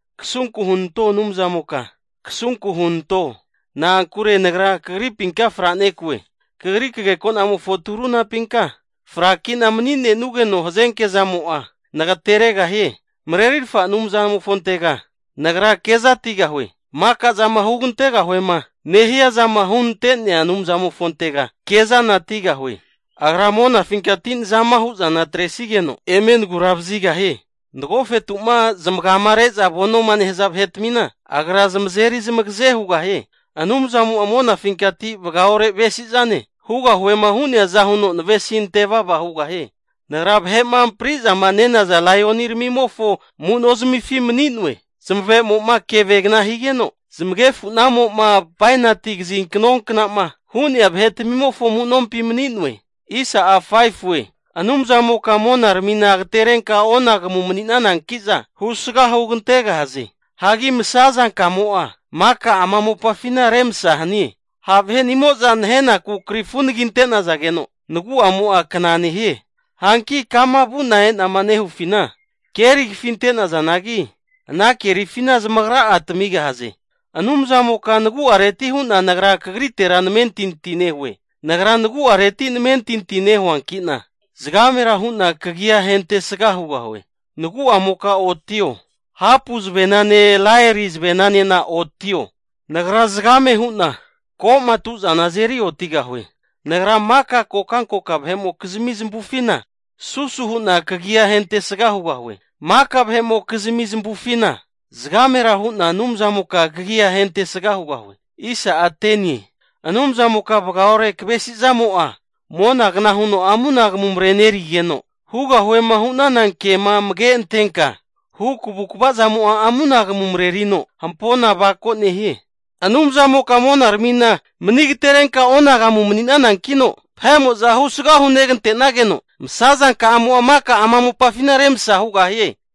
Kasunku hunanto Anumzamoka, kasunku hunanto! Na'ankure nagra kagripinka franekue. Kagri kagekonamofo turunapinka, fraki'na mani'nenugeno hazenke zamo'a nagateregahie. Marerirfa Anumzamofontega nagra kezatigahue. Maka zama hugantegahuema nehia zama hunenantea Anumzamofontega kezanatigahue. Agra monafinkati nazama hu'zana atresigeno eme nagura vazigahie. Nagofetu'ma zamagama re'za vonoma nehaza vahetmina, Agra zamazeri zamagaze hugahie. Anumzamo'a monafinkati vagaore avesizane, hugahuema hu'neaza huno navesinte vava hugahie. Nagra vahe'ma amprizama nenaza laioniramimofo amu'nozmifi mani'noe. Zamave'mo'ma keve kna higeno zamagefu'namo'ma bainati kazinkno kna'ma hu'nea vahetmimofo amu'nompi mani'noe. Anumzamoka monaramina agaterenka onagamu mani'nananki'za husga hugantegahaze. Hagi masazankamo'a maka ama mopafina remsa hanie. Ha' vahe'nimo'za nahenaku krifu anagi ante'nazageno nagu'amo'a kna nehie. Hanki kama vu'na e'nama nehufina, keri kafinte'nazanagi, ana kerifina zamagra'a tamigahaze. Anumzamoka nagu'areti hu'na nagra kagritera namentinti nehue. Nagra nagu'areti namentinti nehuanki'na zagamera hu'na kagia ahentesga hugahue. Nagu'amoka otio. Hapu zavenane laeri zavenanena oti'o. Nagra zagame hu'na ko'matu'zana azeri otigahue. Nagra maka kokankoka vahe'mokizmi zamavufina, susu hu'na kagia ahentesga hugahue. Maka vahe'mokizmi zamavufina zagamera hu'na Anumzamoka kagia ahentesga hugahue. Anumzamoka vagaore kavesizamo'a, monagna huno amunagamu marenerigeno, hugahuema hu'nana kema amage antenka hu kavukava zamo'a amunagamu marerino hampona avako nehie. Anumzamoka monaramina mani agaterenka onagamu mani'nanankino, vahe'mo'za husga hunegante'nageno masazanka'amo'a maka ama mopafina remsa hugahie.